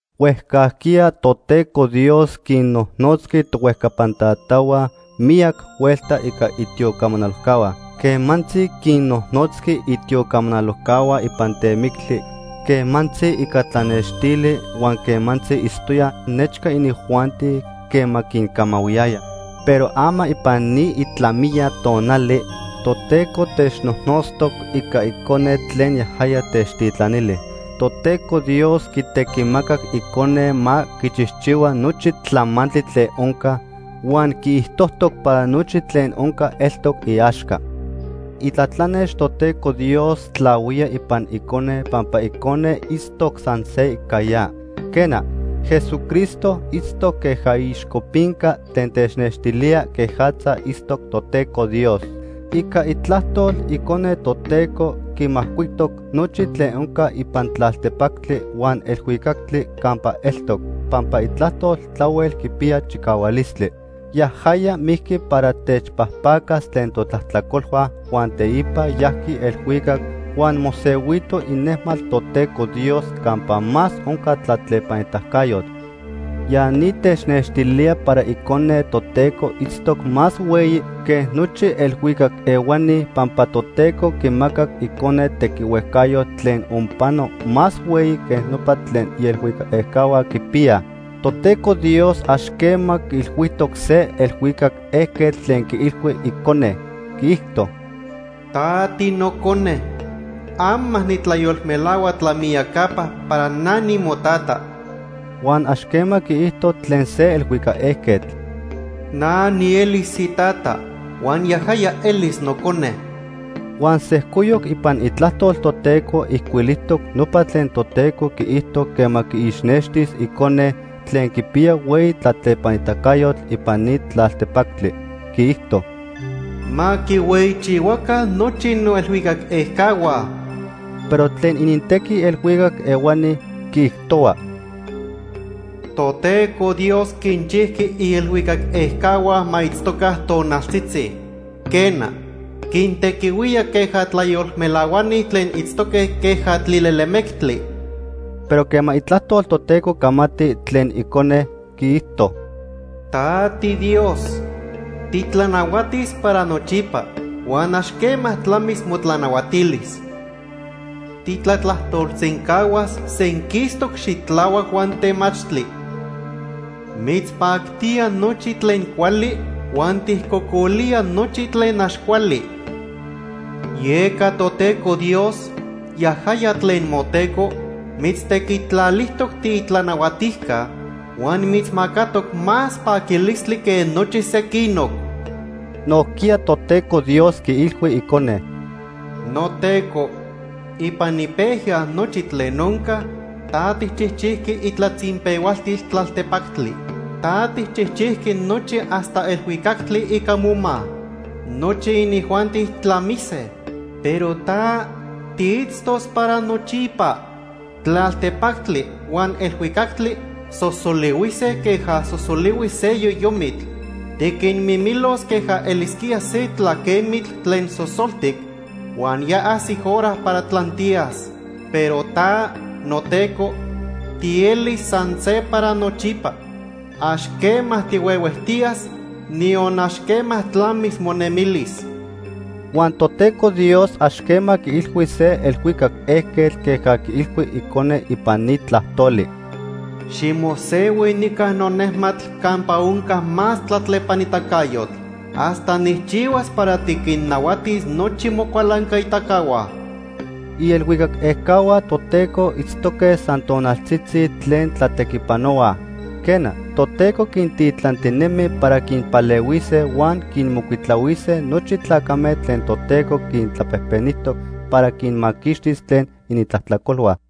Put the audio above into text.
Huejcajquiya Toteco Dios quinnojnotzqui tohuejcapan tatahua miyac huelta ica itiocamanalojcahua. Quemantzi quinnojnotzqui itiocamanalojcahua ipan temictli, quemantzi ica tlanextili huan quemantzi itztoya nechca inijuanti quema quincamahuiyaya. Pero ama ipan ni itlamiya tonali Toteco technojnotztoc ica Icone tlen yajaya techtitlanili. Toteco Dios quitequimacac Icone ma quichijchihua nochi tlamantli tlen onca huan quiijtojtoc para nochi tlen onca eltoc iaxca. Itlatlanex Toteco Dios tlahuía ipan Icone pampa Icone itztoc san se ica ya. Quena, Jesucristo itztoc queja iixcopinca tlen technextilía quejatza itztoc Toteco Dios. Ica itlajtol, Icone Toteco quimajcuitoc nochi tlen onca ipan tlaltepactli huan elhuicactli campa eltoc, pampa itlajtol tlahuel quipiya chicahualistli. Yajaya mijqui para techpajpacas tlen totlajtlacolhua huan teipa yajqui elhuicac huan mosehuito inejmatl Toteco Dios campa más onca tlatlepanitacayotl. Ya ni technextilía para Icone Toteco itztoc más hueyi que nochi elhuicac ehuani, pampa Toteco quimacac Icone tequihuejcayotl tlen onpano más hueyi que nopa tlen ielhuicac ejcahua quipiyaj. Toteco Dios ax quema quiilhuijtoc se elhuicac ejquetl tlen quiilhui Icone. Quiijto: “Ta tiNocone. Ama nitlayolmelahua tlamiyacapa para na nimoTata.” Huan ax quema quiijto tlen se elhuicac ejquetl: “Na nielis iTata huan yajaya elis Nocone.” Huan sejcoyoc ipan iTlajtol Toteco ijcuilijtoc nopa tlen Toteco quiijto quema quiixnextis Icone tlen quipiya hueyi tlatlepanitacayotl ipan ni tlaltepactli. Quiijto: “Ma quihueyichihuaca nochi noelhuicac ejcahua.” Pero tlen inintequi elhuicac ehuani, quiijtohua: “Toteco Dios quinchijqui ielhuicac ejcahua ma itztoca tonaltzitzi. Quena, quintequihuía queja tlayolmelahuani tlen itztoque queja tlilelemectli.” Pero quema Itlajtol Toteco camati tlen Icone, quiijto: “Ta tiDios, titlanahuatis para nochipa huan ax quema tlamis motlanahuatilis. Titlatlajtolsencahuas senquistoc xitlahuac huan temachtli. Mitzpactía nochi tlen cuali huan tijcocolía nochi tlen ax cuali. Yeca Toteco Dios, yajaya tlen moTeco, mitztequitlalijtoc tiitlanahuatijca huan mitzmacatoc más paquilistli que nochi sequinoc.” Nojquiya Toteco Dios quiilhui Icone: “NoTeco, ipan ipejya nochi tlen onca, ta tijchijchijqui itlatzinpehualtil tlaltepactli. Ta tijchijchijqui nochi hasta elhuicactli ica moma. Nochi inijuanti tlamise, pero ta, tiitztos para nochipa. Tlaltepactli huan elhuicactli sosolihuise queja sosolihui se yoyomitl. Tiquinmimilos queja elisquía se tlaquemitl tlen sosoltic huan ya ajsic hora para tlantiyas. Pero ta, noTeco, tielis san se para nochipa. Ax quema tihuehuejtiyas, niyon ax quema tlamis monemilis.” Huan Toteco Dios ax quema quiilhui se elhuicac ejquetl queja quiilhui Icone ipan ni tlajtoli: “Ximosehui nica nonejmatl campa onca más tlatlepanitacayotl, hasta nijchihuas para tiquinnahuatis nochi mocualancaitacahua.” Ielhuicac ejcahua Toteco itztoque san tonaltzitzi tlen tlatequipanohuaj. Quena, Toteco quintitlantinemi para quinpalehuise huan quinmocuitlahuise nochi tlacame tlen Toteco quintlapejpenijtoc para quinmaquixtis tlen inintlajtlacolhua.